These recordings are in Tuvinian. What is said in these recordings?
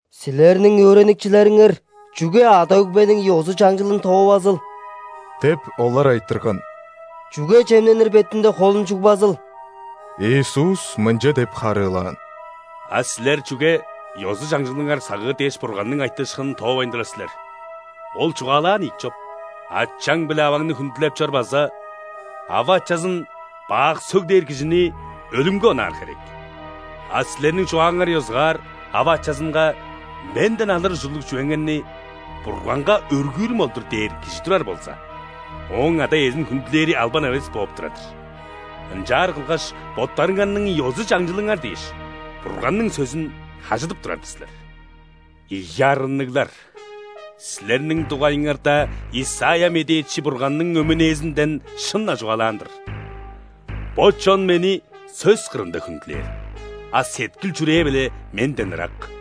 «Силерниң өөреникчилериңер чүге ада-өгбениң ёзу-чаңчылын тоовазыл? – деп, олар айтырган. – Чүге чемненир бетинде холун чугбазыл?» Иисус мынча деп харыылаан: «А силер чүге ёзу-чаңчылыңар сагыыр дээш, Бурганның айтыышкынын тоовайн турар силер? Ол чугаалаан ийик чоп: „Ачаң биле аваңны хүндүлеп чор“ база „Ава-ачазын бак сөглээр кижини өлүмге онаар херек“. А силерниң чугааңар ёзугаар ава-ачазынга: „Менден алыр ужурлуг чүвеңерни Бурганга өргүүрүм ол-дур“ – дээр кижи турар болза, ооң ада-иезин хүндүлээри албан эвес бооп турар-дыр. Ынчаар кылгаш, боттарыңарның ёзу-чаңчылыңар дээш, Бурганның сөзүн хажыдып турар-дыр силер. Ийи арынныглар! Силерниң дугайыңарда Исайя медээчи Бурганның өмүнээзинден шын-на чугаалаан-дыр: „Бо чон Мени сөс кырында хүндүлээр,а сеткил-чүрээ-биле Менден ырак.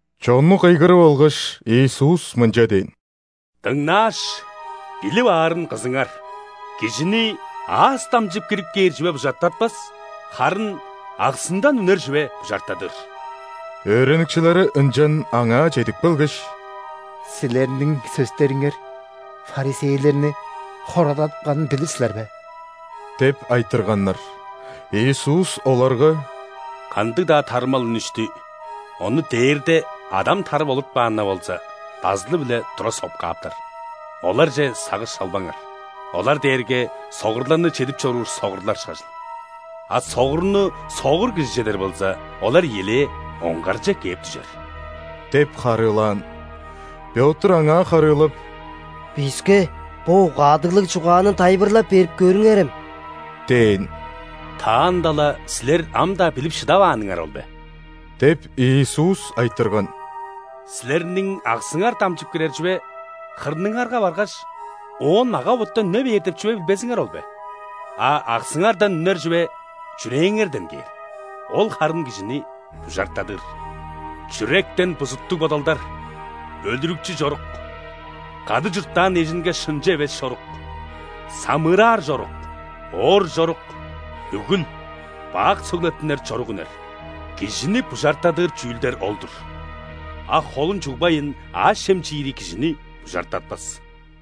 Чонну кыйгырып алгаш, Иисус мынча дээн: «Дыңнааш, билип аарын кызыңар. Кижини аас дамчып кирип кээр чүве бужартатпас, харын аксындан үнер чүве бужартадыр». Өөреникчилери ынчан Аңаа чедип келгеш: «Силерниң сөстериңер ·фарисейлерни хорададыпканын билир силер бе?» – деп айтырганнар. Иисус оларга: «Кандыг-даа тарымал үнүштү, ону Дээрде Адам тарып олуртпаан-на болза, дазылы-биле тура соп кааптар. Оларже сагыш салбаңар. Олар дээрге согурларны чедип чоруур согурлар ышкажыл. А согурну согур кижи чедер болза, олар ийилээ оңгарже кээп дүжер» – деп харыылаан. Пётр Аңаа харыылап: «Биске бо угаадыглыг чугааны тайылбырлап берип көрүңерем» – дээн. «Таанда-ла силер ам-даа билип шыдавааныңар ол бе? – деп, Иисус айтырган. – Силерниң аксыңар дамчып кирер чүве хырныңарга баргаш, оон мага-боттан үне бээр деп билбезиңер ол бе? А аксыңардан үнер чүве чүрээңерден кээр. Ол харын кижини бужартадыр. Чүректен бузуттуг бодалдар, өлүрүкчү чорук, кады чурттаан эжинге шынчы эвес чорук, самыыраар чорук, оор чорук, нүгүл, бак сөглеттинер чорук үнер. Кижини бужартадыр чүүлдер ол-дур. А холун чугбайн, аъш-чем чиири кижини бужартатпас».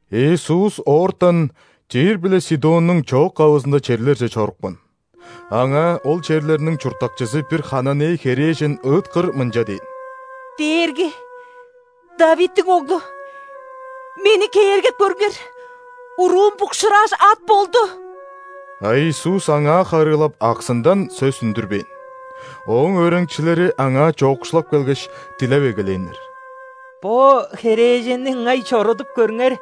Иисус оортан Тир биле Сидоннуң чоок-кавызында черлерже чорупкан. Аңаа ол черлерниң чурттакчызы бир ·хананей херээжен ыыткыр мынча дээн: «Дээрги, ·Давидтиң Оглу! Мени кээргеп көрүңер! Уруум букшуурааш, ат болду». А Иисус аңаа харыылап аксындан сөс үндүрбээн. Ооң өөреникчилери Аңаа чоокшулап келгеш, дилеп эгелээннер: «Бо херээженни ыңай чорудуп көрүңер.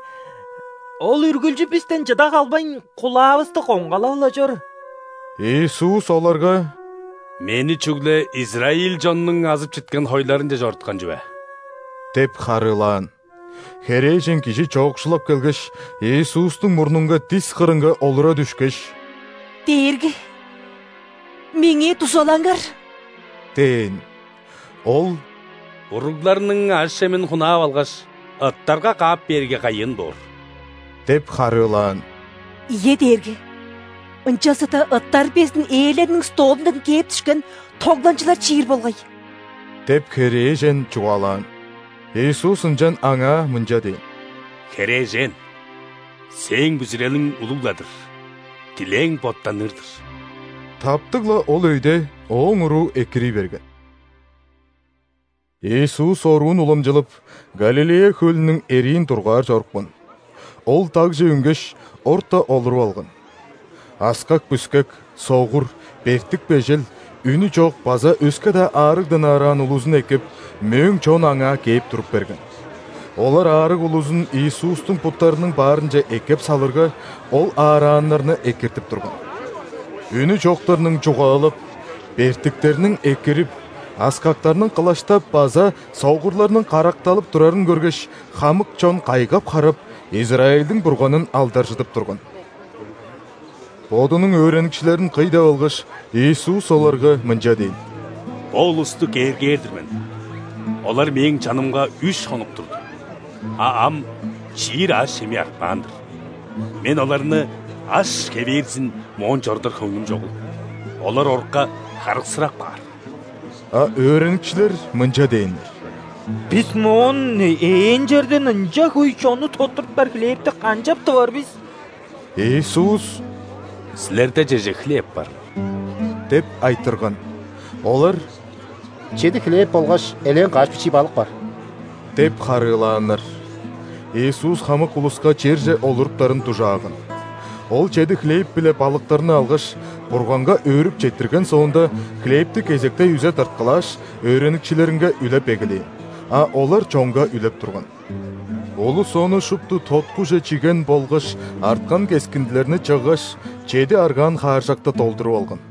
Ол үргүлчү бистен чыда калбайн, кулаавысты коңгалап-ла чор!» Иисус оларга: «Мени чүгле израиль чоннуң азып читкен хойларынче чоруткан чүве» – деп харыылаан. Херээжен кижи чоокшулап келгеш, Иисустуң мурнунга дис кырынга олура дүшкеш: «Дээрги, меңээ дузалаңар!» – дээн. Ол: «Уругларның аъш-чемин хунаап алгаш, ыттарга каап бээрге, кайын боор» – деп харыылаан. «Ийе, Дээрги, ынчалза-даа ыттар безин ээлериниң столундан кээп дүшкен тогланчылар чиир болгай» – деп, херээжен чугаалаан. Иисус ынчан аңаа мынча дээн: «Херээжен, сээң бүзүрелиң улуг-ла-дыр. Дилээң боттаныр-дыр». Таптыг-ла ол өйде ооң уруу экирий берген. Иисус оруун уламчылап, Галилея хөлүнүң эриин дургаар чорупкан. Ол дагже үнгеш, орта олуруп алган. Аскак-бүскек, согур, бертик-бежел, үнү чок база өске-даа аарыгдан аараан улузун эккеп, мөөң чон Аңаа кээп туруп берген. Олар аарыг улузун Иисустуң буттарының баарынче эккеп салырга, Ол аарааннарны экиртип турган. Үнү чоктарның чугаалап, бертиктерниң экирип, аскактарның кылаштап база согурларның каракталып турарын көргеш, хамык чон кайгап-харап, Израильдиң Бурганын алдаржыдып турган. Бодунуң өөреникчилерин кый деп алгаш, Иисус оларга мынча дээн: «Бо улусту кээргээр-дир мен: олар Мээң чанымга үш хонук турду, а ам чиир аъш-чеми артпаан-дыр. Мен оларны аш хевээрзин моон чорудар хөңнүм чогул, олар орукка харыксырап каар». А өөреникчилер мынча дээннер: «Бис моон, ээн черден, ынча хөй чонну тоттуруптар хлебти канчап тывар бис?» Иисус: «Силерде чеже хлеб барыл?» – деп айтырган. Олар: «Чеди хлеб болгаш элээн каш бичии балык бар» – деп харыылааннар. Иисус хамык улуска черже олуруптарын дужааган. Ол чеди хлеб биле балыктарны алгаш, Бурганга өөрүп четтирген соонда, хлебти кезектей үзе тырткылааш, өөреникчилеринге үлеп эгелээн. А олар чонга үлеп турган. Улус ону шупту тоткуже чиген болгаш арткан кескиндилерни чыггаш, чеди аргаан хааржакты долдуруп алган.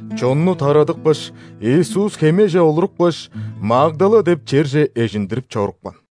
Чонну тарадыпкаш, Иисус хемеже олурупкаш, Магдала деп черже эжиндирип чорупкан.